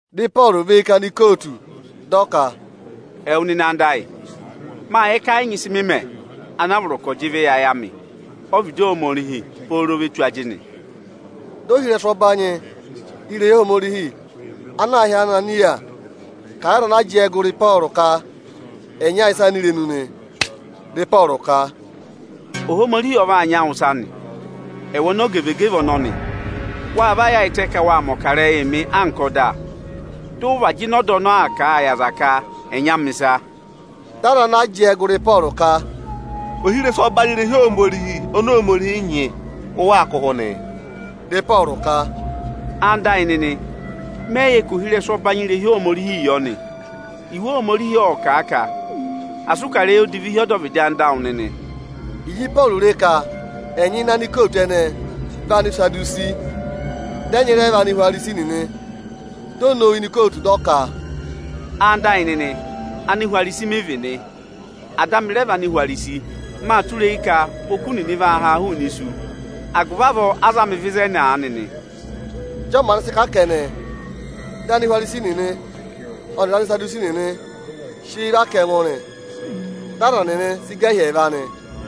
Dị Ịpọọrụ và eyi ká anikootu, dị ọ ka, “Ẹwụ nịnị anda ayị, mâ yẹ ka ẹ yị nyị ịsị mị mẹ anaa vọrọ ka ọ̀ jị ịvị yị ayị amị ọ́vịdị Ohomorihi pooro ve tù ajịnị.” Di ohirẹsụ ọbanyị irehi Ohomorihi ana aā hị́ Ananịya kà a yị aza ana jẹẹ gụrị Ịpọọrụ ka ẹ̀ nya a ịsa ini irenu nị. Dị Ịpọọrụ ka, “Ohomorihi ọ vaa nya wụ ịsa nị, ẹwụ onogevegeve ọnọnị. Wa va yaayịtẹ ka wa mẹ̀ ọkarẹyị mị anka ọda, dị ụ vaa jịnẹ ọda ọnọọ kà a yị aza ka ẹ̀ nya mị ịsa.” Dị aza ana jẹẹ gụrị Ịpọọrụ ka, “Ohirẹsụ ọbanyị irehi Ohomorihi oni Ohomorihi nyị, ụ waa kụ̀ ụhụ nịị?” Dị Ịpọọrụ ka, “Ẹwụ nịnị ẹyịnyara amị, mẹyị yẹ ka ohirẹsụ ọbanyị irehi Ohomorihii yọ nị. Iwe Ohomorihi ộ kà a ka: Asị ụ kà ịrẹyị odivi hi ọdọvịdị anda awụ nịnị.” Ịjị Ịpọọrụ re ka ẹnyị ini anikootu ẹnẹẹ vị Anisadusi, dị ẹnyị rẹ vị Anihwarisi nịnị, di o nowu ini ikootu, dị ọ ka, “Ẹwụ nịnị ẹyịnyara amị, Anihwarisi mị vị nị. Ada amị rẹ vị Anihwarisi. Mâ tụra eyi ka oku nịnị vaa haa hụụnị isu. Agụvị avọọ a za mị vẹ ịzẹnị aanị nị.” Ịjị ọọ maanị sị kà kẹnẹ, dị Anihwarisi nịnị ọnịrị Anisadusi nịnị sị eyi và ká ẹngụ nị. Dị aza nịnị sị gà hi ẹẹva nị.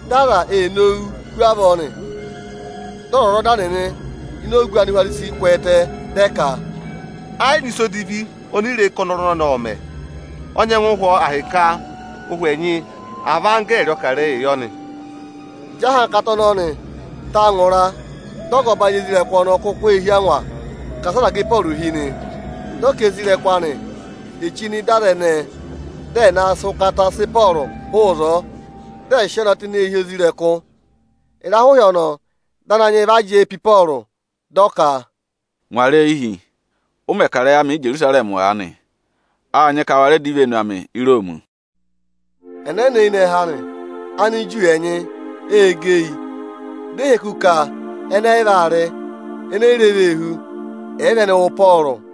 Dị aza ee nowuu hu avọọ nị. Dị ọzwọzọda nịnị ini ogu Anihwarisi kwẹẹtẹ, dị ẹ ka, “Ẹ yị nyị ịsa odivi oni i re ka ọnọrụ ọnọnị ộ mẹ̀. Ọ nyẹngụ hụ ọọ ahịka ụhwẹ ẹnyị, àa vị anggẹẹrị ọ kà ịrẹyịị yọ nị.” Ịjị ahankata ọnọnị ta ngụra, dị ọga ọbanyị isoja nịnị ọnọọ kuku ee hí angwa ka asị aza gà Ịpọọrụ hi nị. Dị ọ ka isoja nịnị anị è chí nọ ịda aza ẹnẹẹ, dị ẹ̀ na sị ụkata sị Ịpọọrụ hụụ ịzọọ, dị ẹ̀ sị ọọ na tụ́ ini eehi isoja nịnị. Ịrahụ ịhị ọnọọ, dị Ananyị yị va jẹẹ pe Ịpọọrụ, dị ọ ka, “Ngwara eyi hi! Ụ mẹ̀ kà ịrẹyị amị Íjerusarẹmị aanị, â nyị ka wa rẹ dọ ivenu amị Íroomi.” Ẹnẹnẹ eyinẹhẹ anị, Aniju ẹnyị ê gẹ eyi, di e hị́ eku ka ẹnị ẹyị vaa rị, eni eyi re vee hú, àyị vị ẹnị wụ Ịpọọrụ.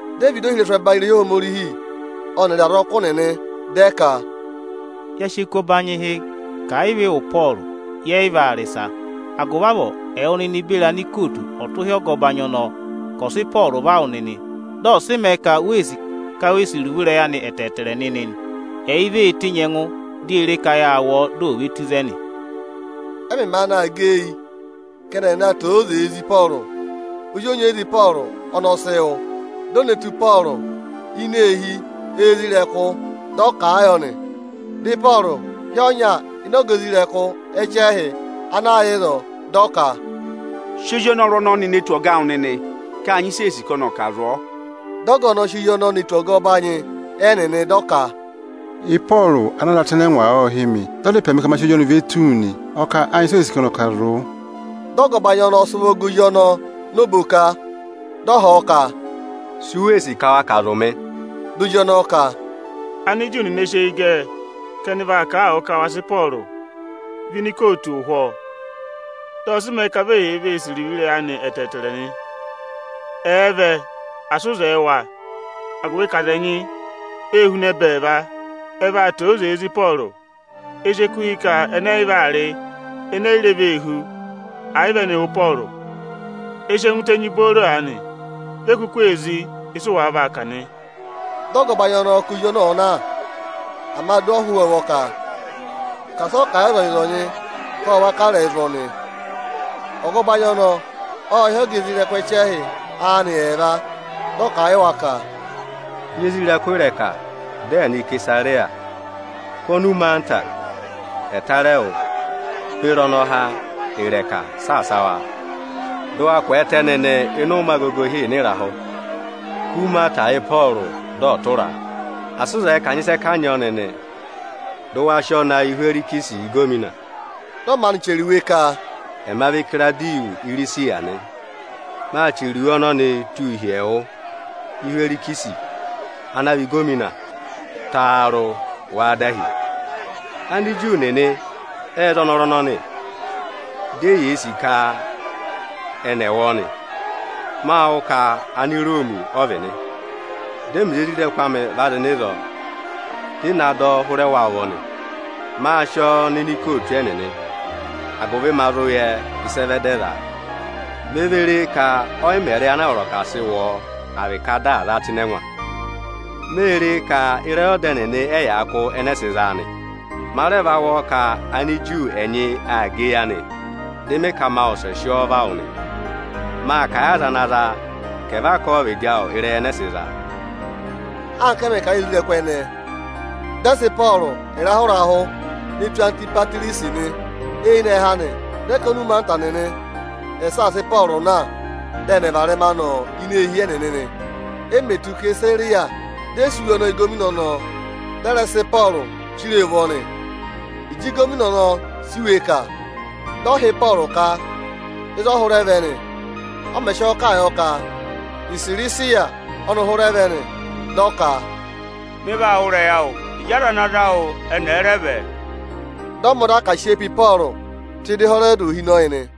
Dị ẹ vẹ ịda ohirẹsụ ẹbanyị irehi Ohomorihi ọnịrị azọkụ nịnị, dị ẹ ka, “Ya sị eku ọbanyị hị́ ka àyị vị ị wụ Ịpọọrụ, yẹ yị vaa rị ịsa. Agụvị avọọ ẹwụ nịnị beri anikootu ọ̀ tụ́ hi ọga ọbanyị ọnọọ ka ọ̀ sị Ịpọọrụ va wụ nịnị, dị ọ̀ sị mẹẹ ka u wee sì ka we sì iruvo ịrẹyị anị ẹtẹẹtẹrẹ nịnị nị. Ẹ yị vee tenyi ẹngụ, di ye re ka yaa wụ ọọ, di ò ve tù ịzẹnị.” Ẹ mẹ̀ maanị aa gẹ eyi ka ẹnị aa naa tẹ ózee zí Ịpọọrụ, ozi onyeyiza Ịpọọrụ ọnị ọ sị wụ́. Di o ne tù Ịpọọrụ ini eehi isoja nịnị, dị ọ kà a yọ nị. Dị Ịpọọrụ hị́ ọnya ịnị ọga isoja nịnị ẹchẹhị ana yà ịzọọ, dị ọ ka, “Sị ozi ọnọrụ ọnọnị ne tù ọga awụ nịnị ka â nyị ịsị ee sì ka ọnị ọ̀ kà zụ̀ ọọ!” Dị ọga ọnọọ sị ozi ọnọọ ne tù ọga ọbanyị ẹnịnị nị. Dị ọ ka, “Ịpọọrụ anaa za tụ́ ịnị ẹngwa ọ hị́ mị, dị ọ dá ịpẹ mị ka ma sị ozi ọnọnị ve tù wu nị. Ọ kà â nyị ịsị ee sì ka ọnị ọ̀ kà zụ̀ wụ.” Dị ọga ọbanyị ọnọọ sị ụvọ gẹ ozi ọnọọ nọ oboka, dị ọ họ̀ ọ ka, “Su wee sì ka wa kà zụ̀ mị?” Di ozi ọnọọ ka, “Aniju nịnị ẹ sị eyi gẹ ka ẹnị ẹ̀ va kà a wụ ka wa sị Ịpọọrụ vẹ ini ikootu ụhwọọ, dị ọ̀ sị mẹẹ ka vi eyee vee sì iruvo ịrẹyị anị ẹtẹẹtẹrẹ nị. Ẹ̀ẹ vẹ, asị ụ zẹẹ wa, agụvị ka aza ẹnyị, ê huna ẹbẹẹva, ẹ vaa tẹ ózee zí Ịpọọrụ. Ẹ sị eku hị́ ka ẹnị ẹyị vaa rị, eni eyi re vee hú, àyị vị ẹnị wụ Ịpọọrụ. Ẹ sị ẹngụ tenyi booro aanị, vi e kuku ee zí ịsụ wàa vaa kà nị.” Dị ọga ọbanyị ọnọọ ka ozi ọnọọ ọ̀ọ na, ama di o hú ọọ ụvọ ka asị ọ kà a yị ọzọnyị-ọzọnyị ka ọ va kà ịrẹyị zụ̀ ọnị. Ọga ọbanyị ọnọọ ộ hị́ ọga isoja nịnị ẹchẹhị anị ẹẹva, dị ọ kà a yị wa ka, “Nyị isoja nịnị ịrẹka dị ẹ̀ nọ Isesariya! Kụ́ onumaata ẹtarẹwụ beri ọnọha ịrẹka saasa wa, dụ wa kwẹẹtẹ nịnị ịnị ụmẹ agogo ịhịịna ịrahụ! Kụ́ umaata yị Ịpọọrụ dị ọ̀ tụraa, asị ụ zẹẹ ka à nyị ịsị ẹ kanyị ọọ nịnị, dụ wa sị ọọ na yị Ịhwẹrịsị ịgọvọnọ!” Dị ọ maanị chẹrẹ iwe ka: “Ẹma vị Ikirawudiyọsị Irisiya nị. Maa chẹrẹ iwe ọnọnịị tụ́ hi ẹwụ Ịhwẹrịsị ana vị ịgọvọnọ. Taarụ! Wáá dahi? Aniju nịnị ệ za ọnọrụ ọnọnị, di eyee sì ka ẹnị ẹ̀ wụ ọọ nị. Mâ wụ́ ka Aniroomi ọ vị nị, dị ẹmịrị isoja nịnị amị va zị nọ ịzọọ, dị ị na dọ ọ hụrẹ wa ụvọ nị. Mâ sị ọọ nọ ini ikootu ẹnịnị, agụvị ma zụ yẹ ịsị ẹ vẹ dị ẹ zaa. Me ve re ka ọyị mẹ ịrẹyị anaa vọrọ ka à sị wụ ọọ, à vị ka dị à zaa tụ́ ịnị ẹngwa. Mê re ka ịrẹyị ọda ẹnịnị ẹ́ yaa kụ́ ẹnẹẹ sị zaa nị. Ma rẹ va wụ́ ka Aniju ẹnyị aa gẹ eyi anị, dị mị ka ma wụsẹ sị ọọ va wụ nị. Mâ kà a yị aza ana zaa, ka ẹ̀ vaa kà a ọ́vịdị awụ ịrẹyị ẹnẹẹ sị zaa.” Anka a mẹ̀ kà a yị isoja nịnị ẹnẹẹ, dị ẹ sị Ịpọọrụ ịrahụ-ịrahụ ne tù Antipatirisi nị. Eyinẹhẹ anị, dị ẹ ka onumaata nịnị ẹ̀ saasa Ịpọọrụ na, dị ẹnị varẹma nọ ini eehi ẹnịnị nị. E mè tù Isesariya, dị ẹ sị iwe ọnọọ yị ịgọvọnọ ọnọọ, dị ẹ rẹ sị Ịpọọrụ chiree ụvọ nị. Ịjị ịgọvọnọ ọnọọ sị iwe kà, dị ọ họ̀ Ịpọọrụ ka ịzị ọ hụrẹ vẹ nị. Ọ mẹ̀ sị ọọ kà a yọ ka Isirisiya ọ́nị hụrẹ vẹ nị, dị ọ ka, “Mị vaa wụ́ ịrẹyị awụ, ịjị aza ana za wụ ẹnị ẹ̀ẹ rẹ vẹ.” Dị ọ mẹ ọda ka à sị eyi pe Ịpọọrụ tụ́ ịda Ịhẹrọdị ohinọyị nị.